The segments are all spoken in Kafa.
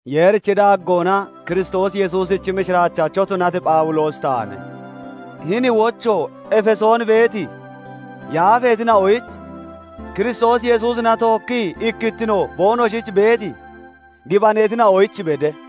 Yeerichi daaggoona Kiristoos Yesuusichi mishiraachacho tunati Phawuloosi taane; hini wocho Efesoon beeti yaafeetina'oyich, Kiristoos Yesuusina tookkii ikkittino boonoshich beeti gibaneetina'oyich bede;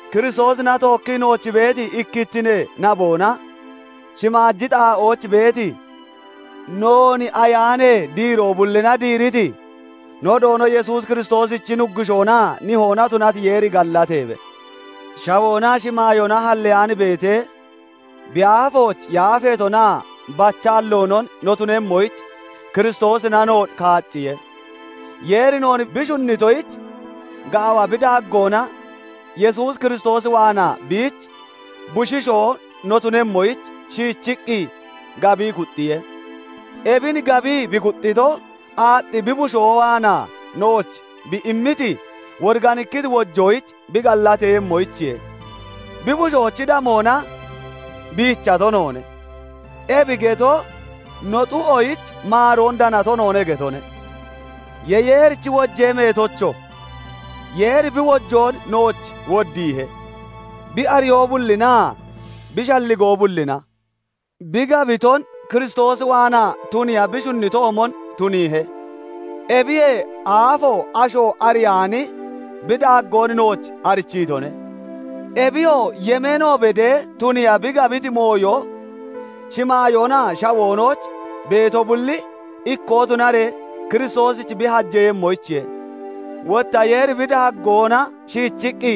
Kiristoosina tookkii nooch beeti ikkittinee naboona shimaaji xaa'ooch beeti noon Ayaanee diiroo bullina diiriti, no Doono Yesuus Kiristoosichi Nuggushoonaa Nihoona tunati Yeeri gallateebe. Shawoonaa shimaayoona halleyaan beetee, bi aafooch yaafeetonaa bachaalloonon no tunemmoyich Kiristoosina noon kaacciye; Yeeri noon bi shunnitoyich, gaawa bi daaggoona Yesuus Kiristoos waanaa biich bushiishoo no tunemmoyich shiichiqqi gabii kuxxiye. Ebin gabii bi kuxxito, aaxxi bi bushoo waanaa nooch bi immiti, woriganikkiti wojoyich bi gallateeyemmoyichiye. Bi bushoochi damoona biichato noone; ebi getoo no xu'oyich maaroon danato noone getone; ye Yeerichi wojee meetocho! Yeeri bi wojoon nooch woddiihe. Bi ariyoo bullinaa bi shalligoo bullina bi gabiton Kiristoos waanaa tuniiya bi shunnitoomon tuniihe; ebiyee aafoo asho ariyaani bi daaggoon nooch arichiitone. Ebiyoo yemeeno bedee tuniiya bi gabiti mooyo, shimaayoonaa shawoonooch beeto bulli ikkoo tunaree Kiristoosich bi hajeeyemmoyichiye. Wotta Yeeri bi daaggoona shiichiqqi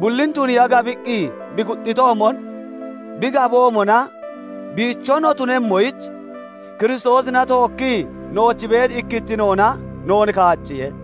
bullin tuniiya gabiqqi bi kuxxitoomon, bi gaboomona, biicho no tunemmoyich Kiristoosina tookkii nooch beeti ikkittinoona noon kaacciye.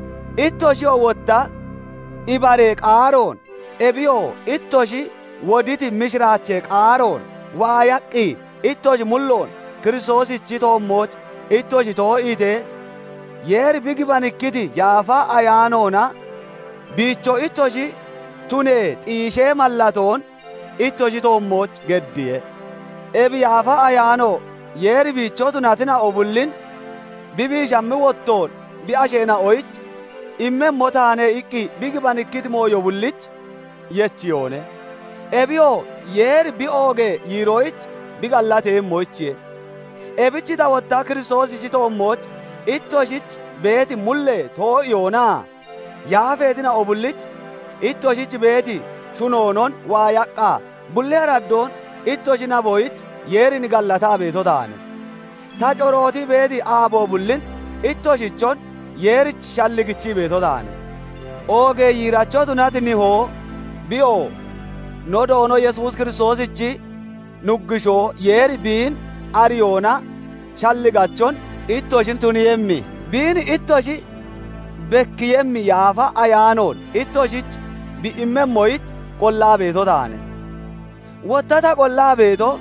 Ittoshiyoo wotta ibaree qaaroon, ebiyoo ittoshi woditi mishiraachee qaaroon, waayaqqi ittoshi mulloon Kiristoosichi toommooch ittoshi too'iitee, Yeeri bi gibanikkiti Yaafa Ayaanoona biicho ittoshi tunee xiishee mallatoon ittoshi toommooch geddiye. Ebi Yaafa Ayaano Yeeri biicho tunatina'o bullin bi biishammi wottoon bi asheena'oyich "Immemmo taane" iqqi bi gibanikkiti mooyo bullich yechiyoone; ebiyoo Yeeri bi oogee yiiroyich bi gallateeyemmoyichiye. Ebich ta wotta Kiristoosichi toommooch ittoshich beeti mullee too'iyoonaa yaafeetina'o bullich ittoshich beeti shunoonon waayaqqa, bulli araddoon ittoshi naboyich Yeerin gallataa beeto taane; ta corootii beeti aabo bullin ittoshichon Yeerich shalligichii beeto taane. Oogee yiiracho tunati Nihoo, biyoo no Doono Yesuus Kiristoosichi Nuggushoo Yeeri biin ariyoona shalligachon ittoshin tuniiyemmi, biin ittoshich bekkiiyemmi Yaafa Ayaanoon ittoshich bi immemmoyich qollaa beeto taane. Wotta ta qollaa beetoo,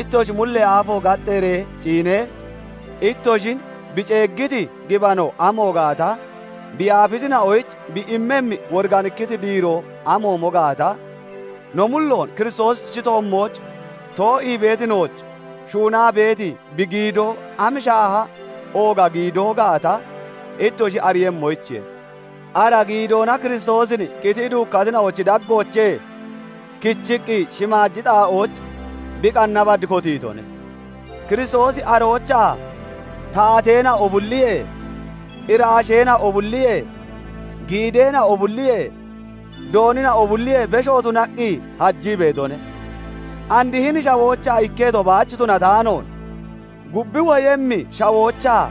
ittoshi mullee aafo gaxxeeree ciinee, ittoshin bi ceeggiti gibano amo gaata, bi yaafitina'oyich bi immemmi woriganikkiti diiroo amoomo gaata, no mulloon Kiristoosichi toommooch too'ii beeti nooch shuunaa beeti bi giidoo am shaaha ooga giidoo gaata ittoshi ariiyemmoyichiye. Ara giidoona Kiristoosin qitii duukkatina'ochi daggoochee kichiqqi shimaaji xaa'ooch bi qanna bad kotiitone. Kiristoosi aroochaa taateena'o bulliyee, iraasheena'o bulliyee, giideena'o bulliyee, doonina'o bulliyee besho tunaqqi hajii beetone; and hini shawoochaa ikketo baach tunataanoon, gub woyemmi shawoochaa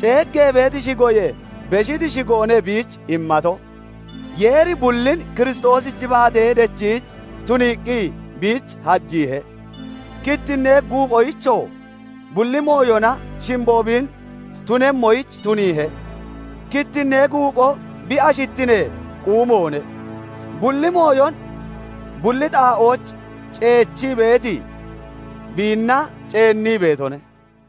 ceeggee beeti shigoyee beshiti shigoone biich immato. Yeeri bullin Kiristoosichi baatee dechiich tuniiqqi biich hajiihe; kittinnee guuphoyichoo bulli mooyona shimbo bi tunemmoyich tuniihe. Kittinnee guuphoo bi ashittinee quumoone; bulli mooyon bulli xaa'ooch ceechii beeti biinna ceennii beetone.